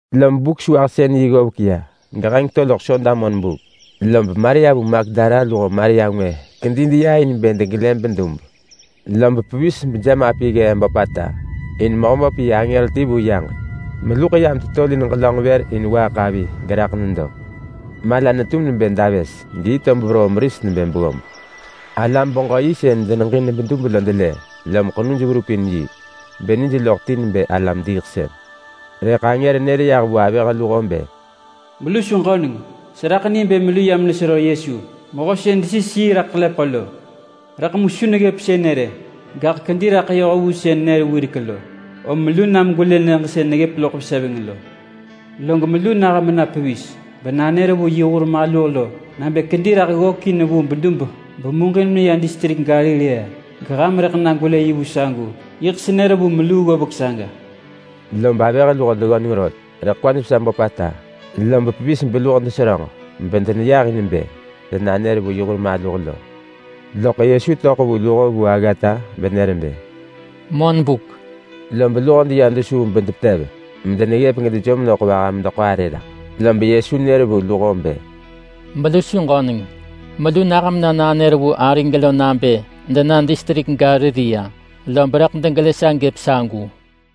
Lob Buk-sewahsën-yi ggovek ya, geheng to loḳ Soda monbuk, lob Maria vu Magdala luho Maria ngwë kedi deya in bë degelë bedub. Lob pevis bejemapi ggee böpata, in Mehöböp yi angër ti vu yaġek meluḳ yam tetolin ġelönġ vër in waaḳ avi geraḳ nedo. Mala netum nebë davës, geyi tob veroo meris nebë beggob. Alam-beġö-yi sën deneġin bedub lo delë, lom ḳenuj verup in yi, benij loḳ ti nebë alam-diiḳsën. Rëḳ angër nër vu avëh luho bë, “Melu su ġöneng! Seraḳ ni bë melu yam nesero Yesu, mehö sën desis yi raḳ ḳelepeḳo lo. Rëḳ mu su neggëp sënë rë! Gaḳ kedi raḳ yoh vu sën nër wirek lo! Om melu nam gwelë nyëġ sën neggëp loḳ veseveng lo. Log melu nah mena pevis, bena nanër vu yi hur maluh lo nabë kedi raḳ ggökin vu bedub bemuġin meya distrik Galilea, geham rëḳ na gwelë yi vu sagu. Yiḳ senër vu meluu ggovek saga!” Lob avëh luho deggöneng rot, rëḳ kwaj vesa böpata, lob pevis beluho deseröġ bedeneyah in bë denanër vu yi hur maluh lo. Loḳ Yesu töḳ vu luho vu aggata benër bë, “Monbuk!” Lob luho deya dus vu bedepetev medeneggëp gedejom loḳ vaha medeḳo arë raḳ. Lob Yesu nër vu luho bë, “Melu su ġöneng! Melu nah mena nanër vu arig lo nabë dena distrik Galilea, lob rëḳ degelë sa gëp sagu.”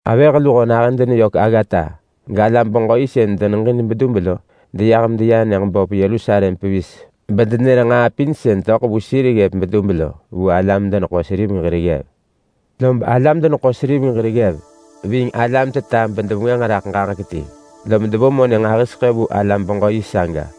Avëh luho nahën deneyök aggata galam-beġö-yi sën deneġin bedub lo deyah medeya nyëġ böp Yerusalem pevis bedenër nġaa pin sën töḳ vu sir ggëp bedub lo vu alam-deneḳo-seriveng hir ggev. Lob alam-deneḳo-seriveng hir ggev ving alam-teta bedevengwënġ raḳ ġaġek ti, lob devo monë nġahiseḳë vu alam-beġö-yi saga,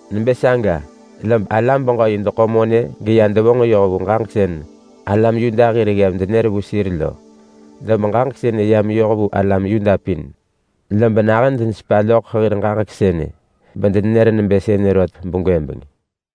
Nebë saga lob alam-beġö-yi deḳo monë geya devonġ yoh vu ġaġek sën alam Yuda hir ggev denër vu sir lo. Lob ġaġek sënë ya meyoh vu alam Yuda pin, lob nahën denesepa loḳ hir ġaġek sënë bedenenër nebë sënë rot begwëbeng.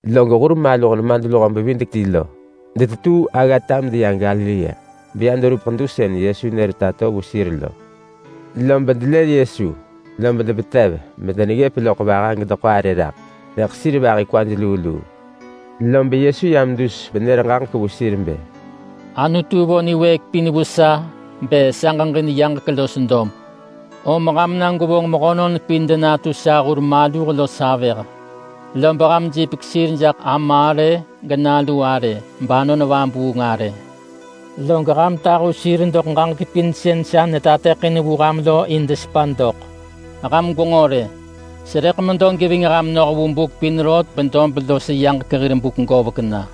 Log hur maluh nemadluho-bevidek-ti lo detetuu aggata medeya Galilea, beya deverup ḳedu sën Yesu nër tato vu sir lo. Lob delë Yesu, lob depetev medeneggëp loḳ vaha gedeḳo arë raḳ, rëḳ sir vahi kwaj luu luu. Lob Yesu yam dus benër ġaġek vu sir bë, “Anutu vo niwëëk pin vu sa bë sa ġeġin yaġek los dob. Om ham na gwevonġ mehönon pin denatu sa hur maluh los avëh. Lob ham jipek sir jaḳ Ama arë, geNalu arë, bAnon Vabuung arë. Log ham tahu sir doḳ ġaġek pin sën sa netateḳin vu ham lo in desepa doḳ. Ham gwenġo rë! Serëḳ medo geving ham noh vu buk pin rot bedob los yaġek hir buk govek na.”